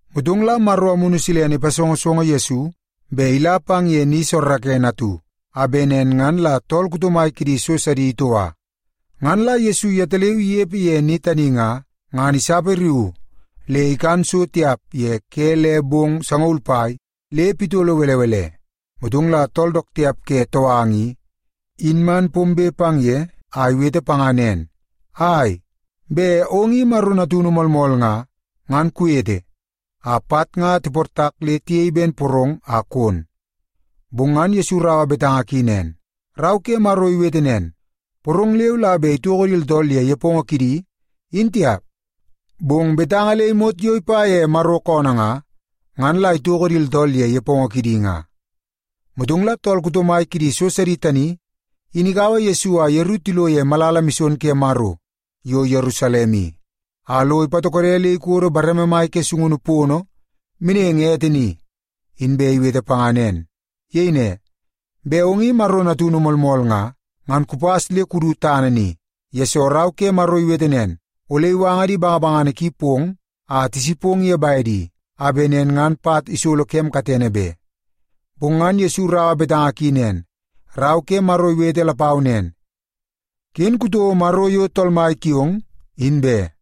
Motong la Maro Amunu Silene ipasongosongo Yesu bet ila pang ye ni soorookoonoo atu, a bet nen ngan la tool kuto mai kidi so sidi itoua. Ngan la Yesu yetaleu inepe ye ni tani nga, ngan isapariuu le ikan so tiap ye ke le bong sangaul pai le pitolo belebele. Motong la tool dook tiap ke touanga i, in man pombe pang ye a iwete panga nen, “Ai, bet ong i Maro natunu moolmool nga, ngan kuwete a pat nga tiportak le tiyei porong a kon.” Bong ngan Yesu iraua betanga ki nen, “Rau ke Maro iwete nen, ‘Porong leu la bet itoko di tooltool ye nepongo kidi, in tiap, bong betanga le imot yo ipa ye Maro koonoo nga, ngan la itoko di tooltool ye nepongo kidi nga.’” Motong la tool kuto mai kidi so sidi tani in ikaua Yesu a yeru tilo ye malala mison ke Maro yo Yerusalem i, a lo ipatokode le ikodo bareme mai ke sungunu pono meneng ete ni, inbe iwete panga nen. Iyei ne, “Bet ong i Maro natunu moolmool nga, ngan kupas le kudu tana ni, yesoo Rau ke Maro iwete nen, ‘Ole iwanga di bangabangana ki pong a tisipong ye bedi, a bet nen ngan pat isolo kem katene be.’” Bong ngan Yesu iraua betanga ki nen, “Rau ke Maro iwete lapau nen, ‘Ken kutouo Maro yo Tool Mai kiong, in be.’”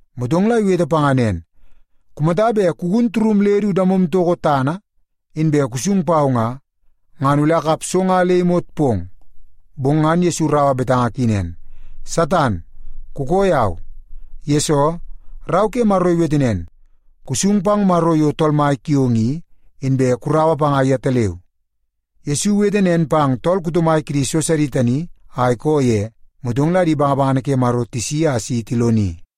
Motong la iwete panga nen, “Kumata bet kugun turum le du damom toko tana, inbe kusung pau nga, ngan ole akap so nga le imot pong.” Bong ngan Yesu iraua betanga ki nen, “Satan, kukoo yau! Yesoo, Rau ke Maro iwete nen, ‘Kusung pang Maro yo Tool Mai kiong i, inbe kuraua panga yetaleu.’” Yesu iwete nen pang tool kuto mai kidi so sidi tani a ikoo ye, motong la di bangabangana ke Maro tisi a si tiloni.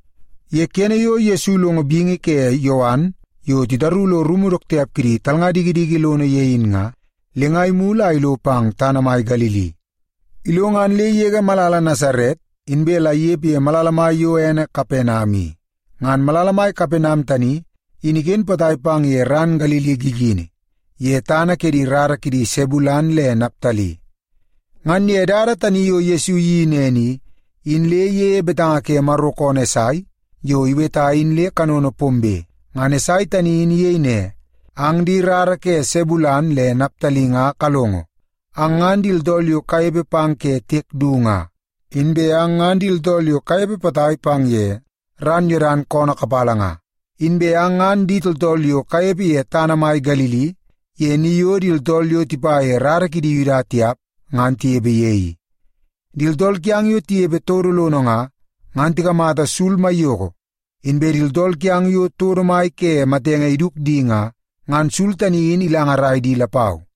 Ye kene yo Yesu ilongo bingi ke Yowan yo titaru lo rumu dook tiap kidi talnga dikidiki lono ye in nga, le nga imulu a ilo pang tana mai Galili. Ilo, ngan le igege malala Nasaret, inbe la inepe ye malala mai yo ene Kapenam i. Ngan malala mai Kapenam tani in iken potai pang ye ran Galili gigini, ye tana ke di rara kidi Sebulen le Naptali. Ngan ye dada tani yo Yesu iyeii nen i, in le iyeie betanga ke Maro koonoo Esai yo iweta in le kanono pombe. Ngan Esai tani in iyei ne, “Ang di rara ke Sebulen le Naptali nga kalongo. Ang ngan di tooltool yo kanepe pang ke tiek du nga, inbe ang ngan di tooltool yo kanepe potai pang ye ran Yodan koonoo kapala nga, inbe ang ngan di tooltool yo kanepe ye tana mai Galili ye ni yo di tooltool yo tipa ye di rara kidi Yuda tiap ngan tinepe ye i. Di tooltool kiang yo tinepe todo lono nga, ngan tikamata sul maiyoko. Inbe di tooltool kiang yo todo mai ke matenge iduk di nga, ngan sul tani in ilangarai di lapau.”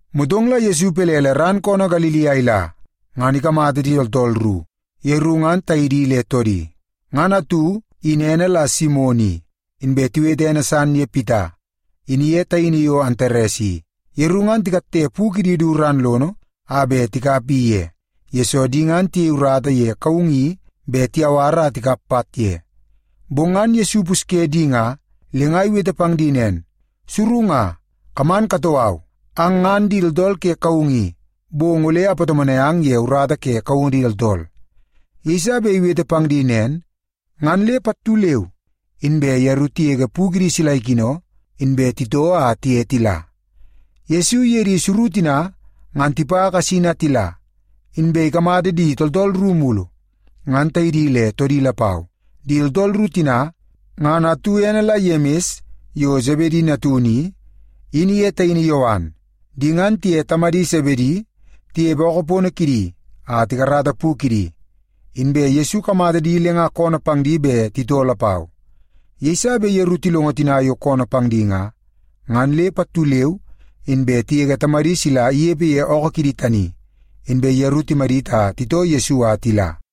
Motong la Yesu ipelele ran koonoo Galili a ila, ngan ikamata di tooltool ru, yeru ngan taidi le toodi. Ngan atu, in ene la Simon i, inbe tiwete ene san ye Pita, in iye taini yo Antares i. Yeru ngan tikatte pu kidi du ran lono a bet tikap i ye, yesoo di ngan tiyei urata ye kaungu i bet tiyawar a tikap pat ye. Bong ngan Yesu ipusye di nga, le nga iwete pang di nen, “Suru nga, kaman katoo au. Ang ngan di tooltool ke kaungu i, bong ole apatomonai ang ye urata ke kaungu di tooltool.” Yeiso bet iwete pang di nen, ngan le pattu leu inbe yeru tigege pu kidi sila ikino, inbe titoo a tiye tila. Yesu iye di suru tina ngan tipa kasin a tila, inbe ikamata di tooltool ru mulu, ngan taidi le toodi lapau. Di tooltool ru tina, ngan atu ene la Yemis yo Sebedi natunu i, in iye taini Yowan. Di ngan tiye tamadi Sebedi tinepe ookoo pono kidi a tikarata pu kidi, inbe Yesu ikamata di le nga koonoo pang di bet titoo lapau. Yeiso bet yeru tilongo tina yo koonoo pang di nga, ngan le pattu leu inbe tigege tamadi sila inepe ye ookoo kidi tani, inbe yeru timadit a titoo Yesu a tila.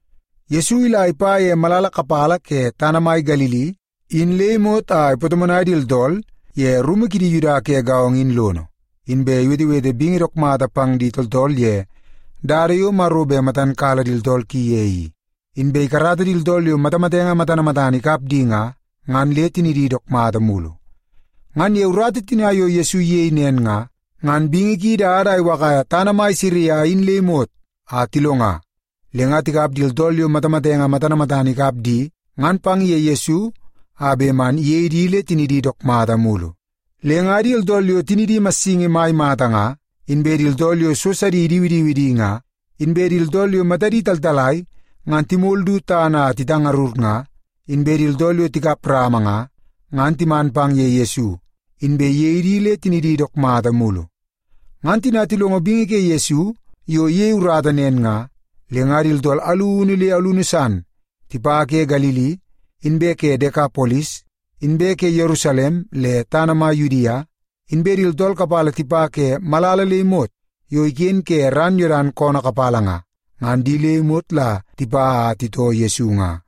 Yesu ila ipa ye malala kapala ke tana mai Galili in le imot a ipatomonai di tooltool ye rumu kidi Yuda ke gaongo in lono, inbe iwetewete bingi dook mata pang di tooltool ye dada yo Maro bet matan kala di tooltool ki ye i. Inbe ikarata di tooltool yo matamatenge matana matana ikap di nga, ngan le tinidi dook mata mulu. Ngan ye urata tina yo Yesu iyei nen nga, ngan bingi ki idada a iwakaia tana mai Siria in le imot a tilonga, le nga tikap di tooltool yo matamatenge matana matana ikap di ngan pang ye Yesu a bet man iyei di le tinidi dook mata mulu. Le nga di tooltool yo tinidi massingi mai mata nga, inbe di tooltool yo so sidi idiwidiwi di nga, inbe di tooltool yo matadi taltalai ngan timol du tana a titangarur nga, inbe di tooltool yo tikap rama nga, ngan timan pang ye Yesu, inbe iyei di le tinidi dook mata mulu. Ngan tina tilongo bingi ke Yesu yo iyei urata nen nga, le nga di tooltool alunu le alunu san tipa ke Galili, inbe ke Dekapolis, inbe ke Yerusalem le tana mai Yudia, inbe di tooltool kapala tipa ke malala le imot yo iken ke ran Yodan koonoo kapala nga, ngan di le imot la tipa a titoo Yesu nga.